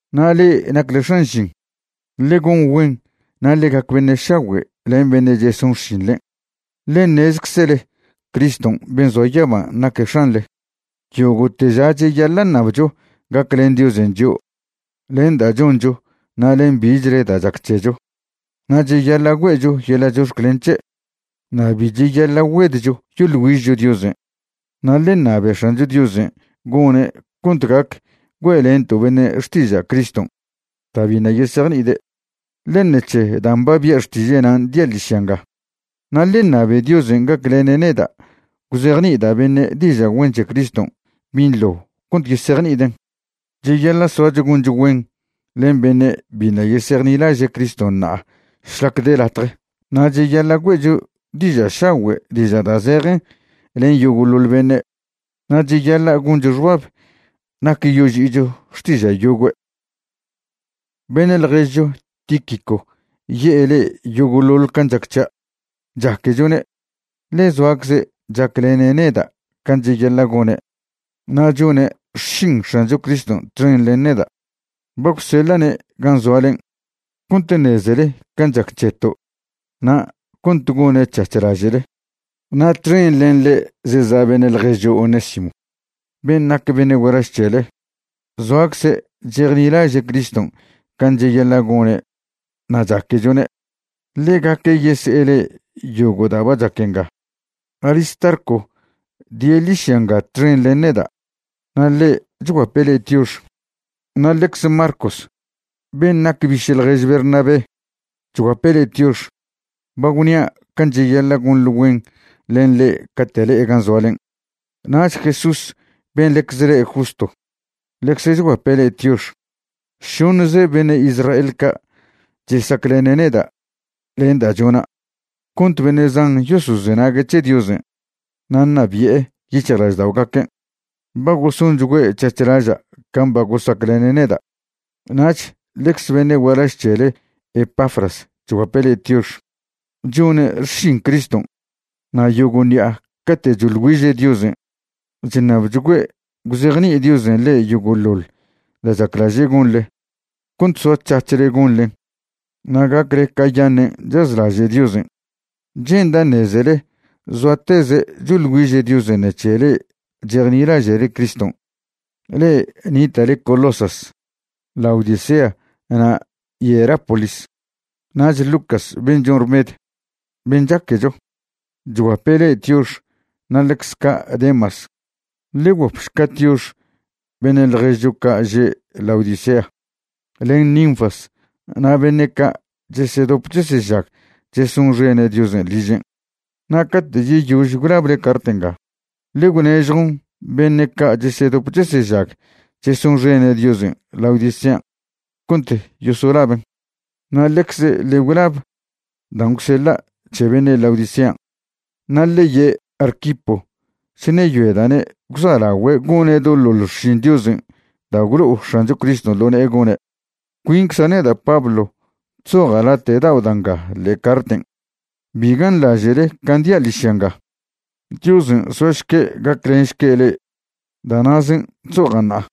Na' le'e nacle x̱an žin, ḻe gon güen na' ḻe gac beṉe' šagüe' len beṉe' cheson xšinḻen', ḻe ṉezczele Criston' ben' zoa yaban' naque' X̱anḻe. Yogo'te ža cheyaḻa' ṉabcho gaclen Diosen' chio' len da' choncho na' len bichle da' chac c̱hecho, na' cheyaḻa' güe'cho yeḻa' chox̱clen c̱he', na' bi cheyaḻa' güedcho yoḻ güižcho Diosen'. Na' ḻe ṉabe X̱ancho Diosen' gone' cont gac güe'lento' beṉe' xtiža' Criston' da' biṉa' yesejni'ide', ḻe ṉec̱he dan' ba bia' xtiže'nan' dia' ḻižya nga. Na' ḻe ṉabe Diosen' gaclene' neda' gwzejni'ida' beṉe' diža' güen c̱he Criston' binḻo cont yesejni'iden'. Cheyaḻa' soacho goncho güen len beṉe' biṉa' yesejnilaže' Criston' ṉa'a šlac de latje. Na' cheyaḻa' güe'cho diža' šagüe' diža' da' zejen len yogo'ḻoḻ beṉe', na' cheyaḻa' goncho xbab nac yoži'icho xtiža' yogüe'. Beṉe' ḻježcho Tíquico ye'e le'e yogo'ḻoḻ can' chac c̱hia'. Chaquechone', ḻe zoacze' chaclene' neda' can' cheyaḻa' gone' na' chone' xšin X̱ancho Criston' txen len neda'. Ba gwseḻa'ne' gan' zoalen' cont ṉezele can' chac c̱heto' na' cont gone' c̱hac̱h laže'le. Na' txen len ḻe' zeza' beṉe' ḻježcho Onésimo ben' nac beṉe' gualaž c̱hele. Zoacze' chejnilaže' Criston' can' cheyaḻa' gone' na' chaquechone'. Ḻegaque' yese'e le'e yogo' da' ba chac nga. Aristarco die' ḻižya nga txen len neda', na' ḻe' chguape' le'e tiox. Na' ḻecze Marcos ben' nac biše' ḻjež Bernabé chguape' le'e tiox. Ba gwnia' can' cheyaḻa' gonḻe güen len ḻe' cate' le'e gan' zoalen'. Nach Jesús ben' ḻecze le' Justo ḻecze chguape' le'e tiox. Šoṉze beṉe' Israel ca' chesaclene' neda' len da' chona' cont beṉe' zan yosozenague' c̱he Diosen' na' ṉabi'e yic̱hjlažda'ogaquen'. Ba gosonchgüe' c̱hac̱h laža' can' ba gosaclene' neda'. Nach ḻecze beṉe' gualaž c̱hele Epafras chguape' le'e tiox. Chone' xšin Criston' na' yogo' ṉi'a cate' choḻ güiže' Diosen' chṉabchgüe' gwzejni'i Diosen' le'e yogo'ḻoḻ da' chaclaže' gonḻe cont soac̱hac̱hle gonḻen na' gacle cayaṉen' chazlaže' Diosen'. Che'nda' ṉezele zoateze' choḻ güiže' Diosen' ṉec̱he le'e chejnilaže'le Criston' le'e nita'le Colosas, Laodicea na' Hierápolis. Nach Lucas ben' chon rmed, ben' chaquecho, chguape' le'e tiox na' ḻecze ca' Demas. Ḻe gwguapšca tiox beṉe' ḻježcho ca' že' Laodicea, len Ninfas na' beṉe' ca' chesedop chesežag chesonxene' Diosen' ližen'. Na' cate' yeyož gwlable cart nga, ḻe gwnežjon beṉe' ca' chesedop chesežag chesonxene' Diosen' Laodicean' cont yosolaben'. Na' ḻecze ḻe gwlab dan' gwseḻa' c̱he beṉe' Laodicean'. Na' ḻe ye' Arquipo chṉeyoeda'ne' gwza'lagüe' gone' doḻoḻ xšin Diosen' da' gwlo'o X̱ancho Criston' ḻo ne'e gone'. Cuincza' neda' Pablo chzoja' late' dao' da' nga ḻe'e carten'. Bi ganḻaže'le can' dia' ḻižya nga. Diosen' soašque' gaclenšque' le'e. Da' na'zen' chzoja' ṉa'a.